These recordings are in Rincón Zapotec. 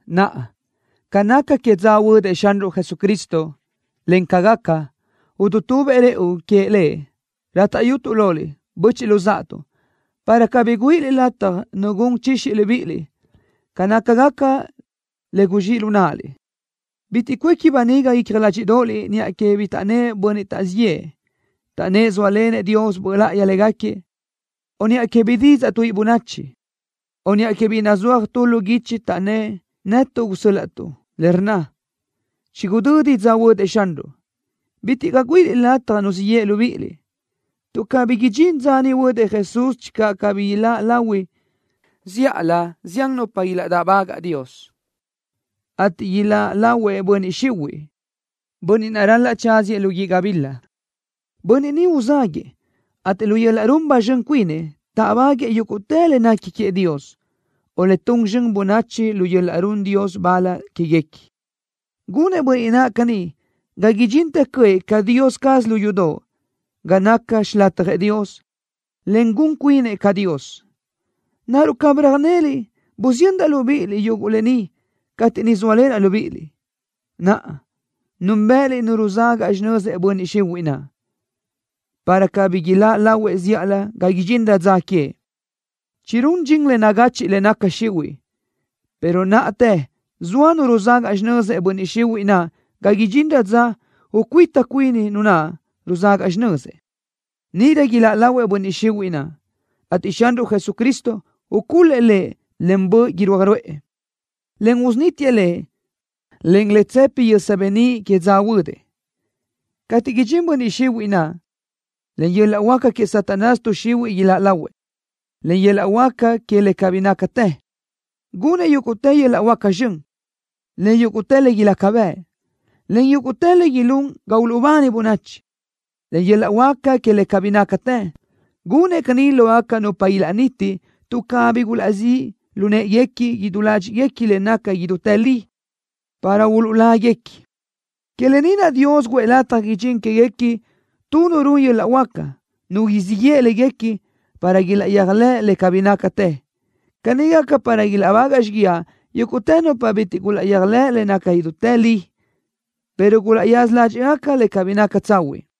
Naʼa, ca naca que dza huödëʼ Xanruʼ Jesucristo, en ca gaca, udutubëʼ rëʼu queëʼ Lëʼ, rátaʼyutuʼ loliʼ, böchiʼ luzáʼatuʼ, para cabí güíʼiliʼ lataj nu gun chixi libíʼiliʼ ca nácagaca le guzxíʼ lu náʼaliʼ. Bitiʼ cuéqui böniga icja ládxiʼdoʼoliʼ niʼa que bi taʼnnë́ʼ bönniʼ taʼzíʼ yëʼë, taʼnnë́ʼ zóalenëʼ Dios Böʼ Láʼayi légaquiëʼ, o niʼa que bi didzaʼ tuíʼi bönachi, o niʼa que bi nazúaj tu lu guichi taʼnnë́ʼ netuʼ gusö́l-laʼtuʼ, le rnna: “Chigudödi dza huödëʼ Xanruʼ.” Bitiʼ caʼ güíʼiliʼ lataj nu siʼ yeʼe libíʼiliʼ, tuʼ cabí idxín dza niʼ huödëʼ Jesús channö cabí ilaʼláʼ lahui zíʼalö zián nupa ilaʼdáʼbagaʼ Dios, ateʼ iláʼ lahuëʼ Bönniʼ Xihuiʼ, bönniʼ naʼ ral-laʼ tsáziëʼ lu guíʼ gabila. Bönniʼ ni uzáguëʼë, ateʼ lu yöl-laʼ run ba zxön cuinëʼ táʼbaguëʼë yúguʼtë le nequi queëʼ Dios, o le tun zxön bönachi lu yöl-laʼ run Dios bal quéguequi. Gunëʼ bönniʼ naʼ caní ga idxintë cöʼë ca Dios caz lu yudoʼ ga naca xilatjëʼ Dios, en gun cuinëʼ ca Dios. ¿Naruʼ cabí röjneliʼ busiyöndaʼ libíʼiliʼ yuguʼ lë ni cateʼ niʼ zóalenaʼ libíʼiliʼ? Naʼa, núnbëʼëliʼ Nu ruzagaʼ xinözëʼ Bönniʼ Xihuiʼ naʼ, para cabí iláʼ lahuëʼ zíʼalö ga idxinrö dza queëʼ. Chirún dxin le nagachiʼ que le naca xihuiʼ, pero náʼatë zoa Nu ruzagaʼ xinözëʼ Bönniʼ Xihuiʼ naʼ ga idxinrö dza ucuíta cuini Nu naʼ ruzagaʼ xinözëʼ. Níʼirö iláʼ lahuëʼ Bönniʼ Xihuiʼ naʼ, ateʼ Xanruʼ Jesucristo ucul-lëʼ lëʼ len böʼ irúaj ruʼë, en usunítiëʼ lëʼ len le tsëpi yösa beníʼ que dza huödëʼ. Cateʼ idxinëʼ Bönniʼ Xihuiʼ naʼ, len yöl-laʼ huáca que Satanás tuʼ xihuiʼ iláʼ lahuëʼ. Len yöl-laʼ huáca que le cabí nácatë, gunëʼ yúguʼtë yöl-laʼ huáca zxön, en yúguʼtë le ilaca bëʼ, en yúguʼtë le ilún ga uluʼbani bönachi. Len yöl-laʼ huáca que le cabí nácatë, gunëʼ caní lógaca nupa ilaʼniti tuʼ cabí gulaʼzíʼ lu në́ʼeguequi idú ládxiʼguequi le naca idútë li, para uluʼláguequi. Que lë ni naʼ Dios guʼë lataj idxín quéguequi tu nu run yöl-laʼ huáca, nu siʼ yeʼe léguequi para ilaʼyéajlëʼ le cabí nácatë. Caní gaca para ilaʼbagaʼ xíguiaʼ yúguʼtë nupa bitiʼ gulaʼyéajlëʼ le naca idútë li, pero gulaʼyaza ládxiʼgaca le cabí naca tsahuiʼ.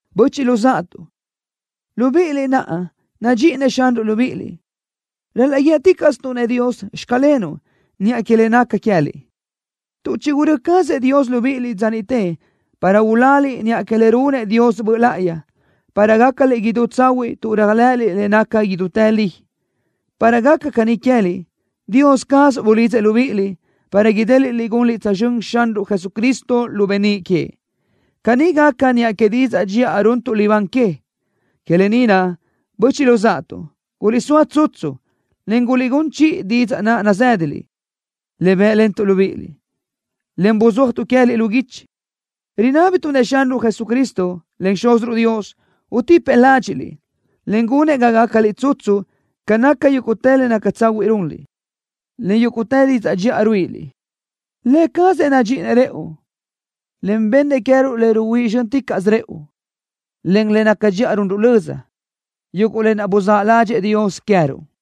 Böchiʼ luzáʼatuʼ, libíʼiliʼ naʼ nadxíʼinëʼ Xanruʼ libíʼiliʼ, ral-laʼ guíëticaʼstuʼ-nëʼ Dios: “Xclenuʼ” niʼa que le naca queë́liʼ, tuʼ chigurö́ cazëʼ Dios libíʼiliʼ dza niʼte para uláliʼ niʼa que le runëʼ Dios Böʼ Láʼayi, para gácaliʼ idú tsahuiʼ tuʼ réajlëʼëliʼ le naca idútë li. Para gaca caní queë́liʼ, Dios caz bulidzëʼ libíʼiliʼ, para idéliʼliʼ gunliʼ tsözxö́n Xanruʼ Jesucristo lu beníʼ queëʼ. Caní gaca niʼa que didzaʼ dxiʼa runtuʼ libán que. Que lë ni naʼ, böchiʼ luzáʼatuʼ, guliʼsóa tsutsu, en guliʼgún chiʼi didzaʼ naʼ nazë́daliʼ, le bë́ʼlentuʼ libíʼiliʼ, en buzúajtuʼ queë́liʼ lu guichi. Rinábituʼ-nëʼ Xanruʼ Jesucristo, en Xúziruʼ Dios, utipëʼ ládxiʼliʼ, en gunëʼ ga gácaliʼ tsutsu ca naca yúguʼtë le naca tsahuiʼ runliʼ, en yúguʼtë didzaʼ dxiʼa ruíʼiliʼ. Lë cazëʼ nadxíʼinëʼ rëʼu, en bennëʼ queë́ruʼ le ruhuíʼ zxö́nticaʼsö rëʼu, en le naca dxiʼa runruʼ löza, yuguʼ lë naʼ buzáʼ ládxëʼë Dios queë́ruʼ.